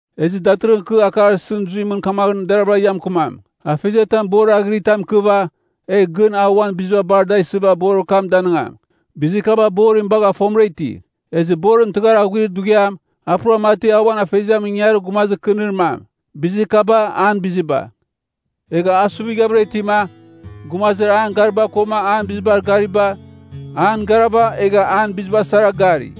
Ezɨ datɨrɨghɨn kɨ akar isɨn zuimɨn bizir kam deravɨra ia mɨkɨmam. Afeziatam borir aghɨritam ikɨva, egh gɨn a uan biziba bar da isɨva borir kam danɨngam. Bizir kaba borim bagha fomɨra iti. Ezɨ borim tɨghar aghuir dughiam, a pura mati a uan afeziamɨn ingangarir gumazir kɨnir mam. Bizir kaba, an biziba. Egha a suvighavɨra itima, gumazir an gariba koma an bizibar gariba, an garava egha an biziba sara gari.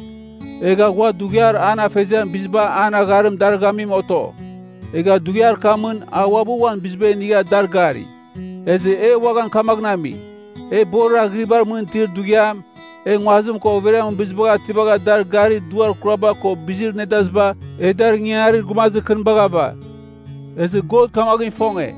Egha ghua dughiar an afeziam biziba an agharim darɨghamim oto. Egha dughiar kamɨn, a uabɨ uan biziba inigha dar gari. Ezɨ e uaghan kamaghɨn ami, e borir aghɨribar mɨn itir dughiam, e nguazim ko overiamɨn bizibagh ativagha dar garir duar kuraba ko bizir nedaziba, e dar ingangarir gumazir kɨnibagh ava. Ezɨ God kamaghɨn ifonge,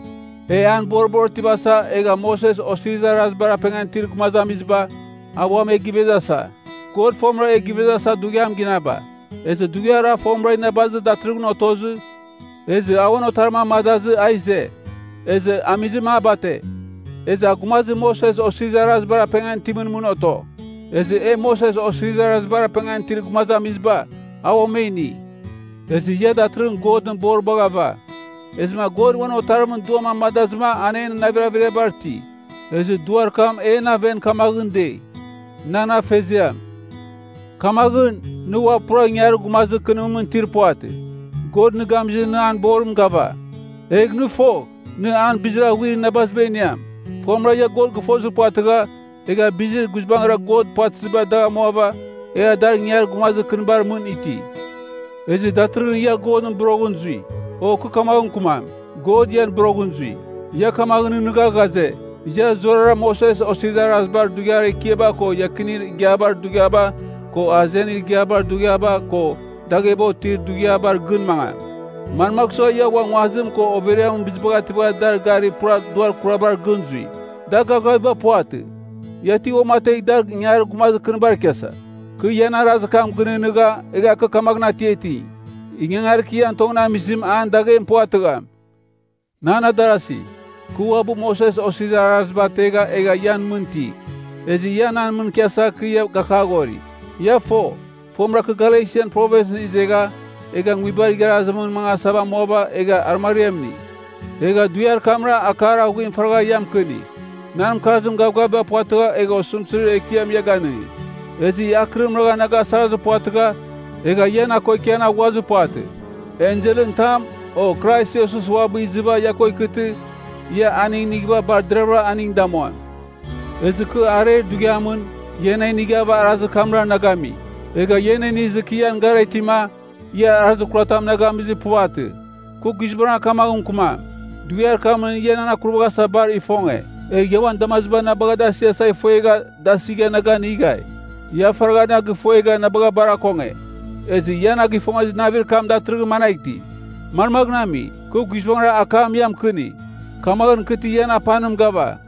e an boribar otivasa, egha Moses Osirizir Arazibar apengan itir gumazamiziba, a uam e givezasa. God fomɨra e givezasa dughiam ginaba. Ezɨ dughiar a fomɨra inabazim datɨrɨghɨn otozɨ, ezɨ a uan otarim amadazɨma a ize. Ezɨ amizim a bate. Ezɨ a gumazir Moses Osirizir Arazibar apengan itimɨn mɨn oto. Ezɨ e Moses Osirizir Arazibar apengan itir gumazamiziba, a ua e ini. Ezɨ ia datɨrɨghɨn Godɨn boribagh ava. Ezɨma God uan Otarimɨn Duam amadazɨma an en navir averiabar iti. Ezɨ Duar kam en aven kamaghɨn dei, “Nan afeziam.” Kamaghɨn, nɨ ua pura ingangarir gumazir kɨnimɨn itir puvatɨ. God nɨ gamizɨ nɨ an borim gava. Egh nɨ fogh, nɨ an bizir aghuir inabaziba iniam. Fomɨra ia God gɨfozir puvatɨgha, egha bizir guizbangɨra God puvatɨziba dagh amuava, egha dar ingangarir gumazir kɨnibar mɨn iti. Ezɨ datɨrɨghɨn ia Godɨn boroghɨn zui. O kɨ kamaghɨn mɨkɨmam, God ian boroghɨn zui. Ia kamaghɨn nɨghnɨgha ghaze, ia zurara Moses Osirizir Arazibar dughiar ekiaba ko iakinir igiabar dughiaba ko azenir igiabar dughiaba ko dagheba otir dughiabar gɨn mangam. Manmagh sua ia ua nguazim ko overiamɨn bizibagh ativagha dar garir pura duar kurabar gɨn zui? Da gavgaviba puvatɨ. Ia ti uamategh dar ingangarir gumazir kɨnibar ikiasa? Kɨ ian arazir kam gɨnɨghnɨgha, egha kɨ kamaghɨn atiati, ingangarir kɨ ian tongɨn amizim an daghem puvatɨgham. Nan adarasi, kɨ uabɨ Moses Osirizir Araziba ategha egha ian mɨn iti. Ezɨ ia nan mɨn ikiasa kɨ ia gakaghori. Ia fo, fomɨra kɨ Galesian Provinsɨn izeghava, egha nguibar igharazitamɨn mangasava amuava egha arɨmariam ini. Egha dughiar kamra akar aghuim faragha ia mɨkɨni. Nan mɨkarzim gavgavim puvatɨgha egha osɨmtɨzir ekiam ia ganɨngi. Ezɨ ia akɨrim ragha na gasarazir puvatɨgha, egha ia na ko ikian aghuazir puvatɨ. Enselɨn tam, o Krais Iesus uabɨ izɨva ia ko ikɨtɨ, ia aning inighɨva bar deravɨra aning damuam. Ezɨ kɨ areir dughiamɨn, ia na inighava arazir kamra na gami. Egha ia na inizɨ kɨ ian gara itima, ia arazir kuratam na gamizir puvatɨ. Kɨ guizbangɨra kamaghɨn mɨkɨmam, dughiar kamɨn ia nan akurvaghasa bar ifonge. Egh ia uan damaziba na bagha da asiasa ifuegha da asigha na ganighai. Ia faragha na gifuegha na bagha bar akonge. Ezɨ ia na gifongezir navir kam datɨrɨghɨn managh iti? Manmaghɨn ami? Kɨ guizbangɨra akam ia mɨkɨni, kamaghɨn kɨ ti ian apanim gava?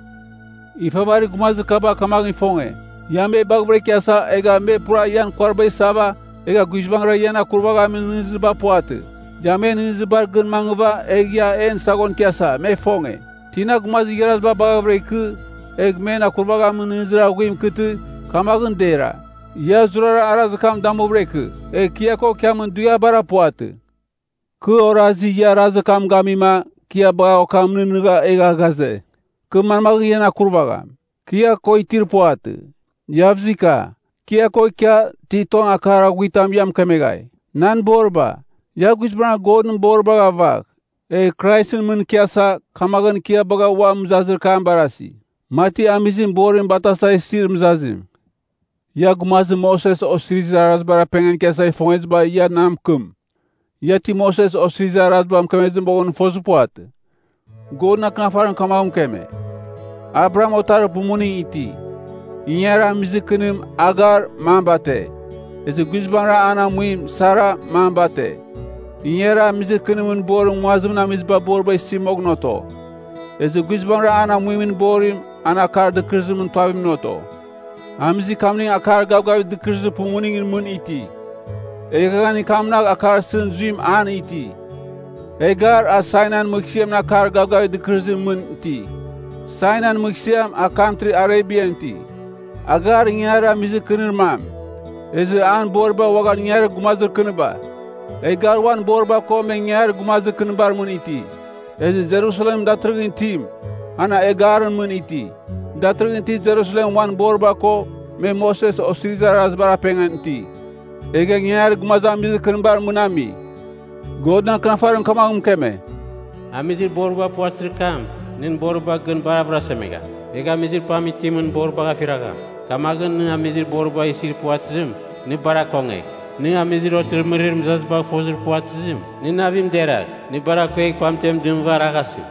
Ifavarir gumazir kaba kamaghɨn ifonge, ia me baghavɨra ikiasa, egha me pura ian kuariba isava, egha guizbangɨra ian akurvaghamin nɨghnɨziba puvatɨ. Ia men nɨghnɨzibar gɨn mangɨva egh ia en saghon ikiasa, me ifonge. Tina gumazir igharaziba baghɨvɨra ikɨ, egh men akurvaghamin nɨghnɨzir aghuim ikɨtɨ, kamaghɨn dera. Ia zurara arazir kam damuvɨra ikɨ. Egh kɨ ia ko ikiamin dughiabara puvatɨ. Kɨ orazi, ia arazir kam gamima, kɨ ia bagha okam nɨghnɨgha egha ghaze, kɨ manmaghɨn ian akurvagham. Kɨ ia ko itir puvatɨ, Iavzika. Kɨ ia ko ikia, ti tong akar aghuitam ia mɨkemeghai. Nan boriba, ia guizbangɨra Godɨn boribagh avagh, egh Kraisɨn mɨn ikiasa, kamaghɨn kɨ ia bagha ua mɨzazir kam barasi. Mati amizim borim batasa isir mɨzazim. Ia gumazir Moses Osirizir Arazibar apengan ikiasa ifongeziba ia na mɨkɨm. Ia ti Moses Osirizir Araziba mɨkemezɨ moghɨn fozir puvatɨ? Godɨn Akɨnafarim kamaghɨn mɨkeme, Abraham otarir pumuning iti. Ingangarir amizir kɨnim, Hagar, mam bate. Ezɨ guizbangɨra an amuim, Sara, mam bate. Ingangarir amizir kɨnimɨn borim nguazimɨn amiziba boriba isi moghɨn oto. Ezɨ guizbangɨra an amuimɨn borim, an akar dɨkɨrɨzimɨn tuavimɨn oto. Amizir kamning akar gavgavir dɨkɨrɨzir pumuningɨn mɨn iti. Eghaghanir kamnagh akar isɨn zuim an iti. Hagar, a Sainain mɨghsɨamɨn akar gavgavir dɨkɨrɨzimɨn mɨn iti. Sainain mɨghsɨam, a kantri Arebian iti. Hagar ingangarir amizir kɨnir mam. Ezɨ an boriba uaghan ingangarir gumazir kɨniba. Hagar uan boriba ko me ingangarir gumazir kɨnibar mɨn ti. Ezɨ Jerusalemɨn datɨrɨghɨn itim, an Hagarɨn mɨn iti. Datɨrɨghɨn itir Jerusalem uan boriba ko, me Moses Osirizir Arazibar apengan iti, egha ingangarir gumazamizir kɨnibar mɨn ami. Godɨn Akɨnafarim kamaghɨn mɨkeme, “Amizir boriba puvatɨzir kam, nɨn boriba gɨn bar avɨrasemegham, egh amizir pam itimɨn boribagh afiragham. Kamaghɨn nɨ amizir boriba isir puvatɨzim, nɨ bar akongegh. Nɨ amizir otɨrɨmɨrir mɨzazibagh fozir puvatɨzim, nɨn navim deragh, nɨ bar akuegh, pamtem dɨmɨva araghasɨ.”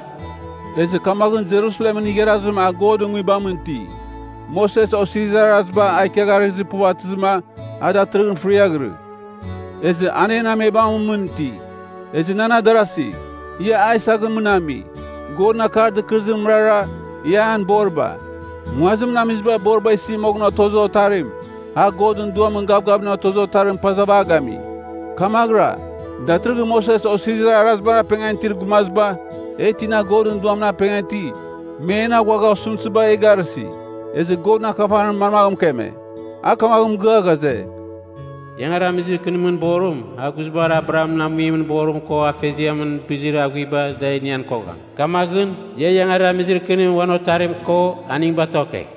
Ezɨ kamaghɨn Jerusalemɨn igharazim a Godɨn Nguibamɨn iti, Moses Osirizir Araziba a ikiagharɨghɨzir puvatɨzɨma, a datɨrɨghɨn fɨriaghɨrɨ. Ezɨ an en amebamɨn mɨn iti. Ezɨ nan adarasi, ia Aisakɨn mɨn ami. Godɨn akar dɨkɨrɨzim mɨrara, ia an boriba. Nguazimɨn amiziba boriba isi moghɨn otozir otarim, a Godɨn Duamɨn gavgavimɨn otozir otarim pazava a gami. Kamaghɨra, datɨrɨghɨn Moses Osirizir Arazibar apengan itir gumaziba, e tina Godɨn Duamɨn apengan iti, me en aghuagha osɨmtɨziba e garɨsi. Ezɨ Godɨn Akɨnafarim manmaghɨn mɨkeme? A kamaghɨn mɨgɨa ghaze, “Ingangarir amizir kɨnimɨn borim, a guizbangɨra Abrahamɨn amuimɨn borim ko afeziamɨn bizir aghuiba da inian kogham. Kamaghɨn, ia ingangarir amizir kɨnim uan otarim ko aning batokegh.”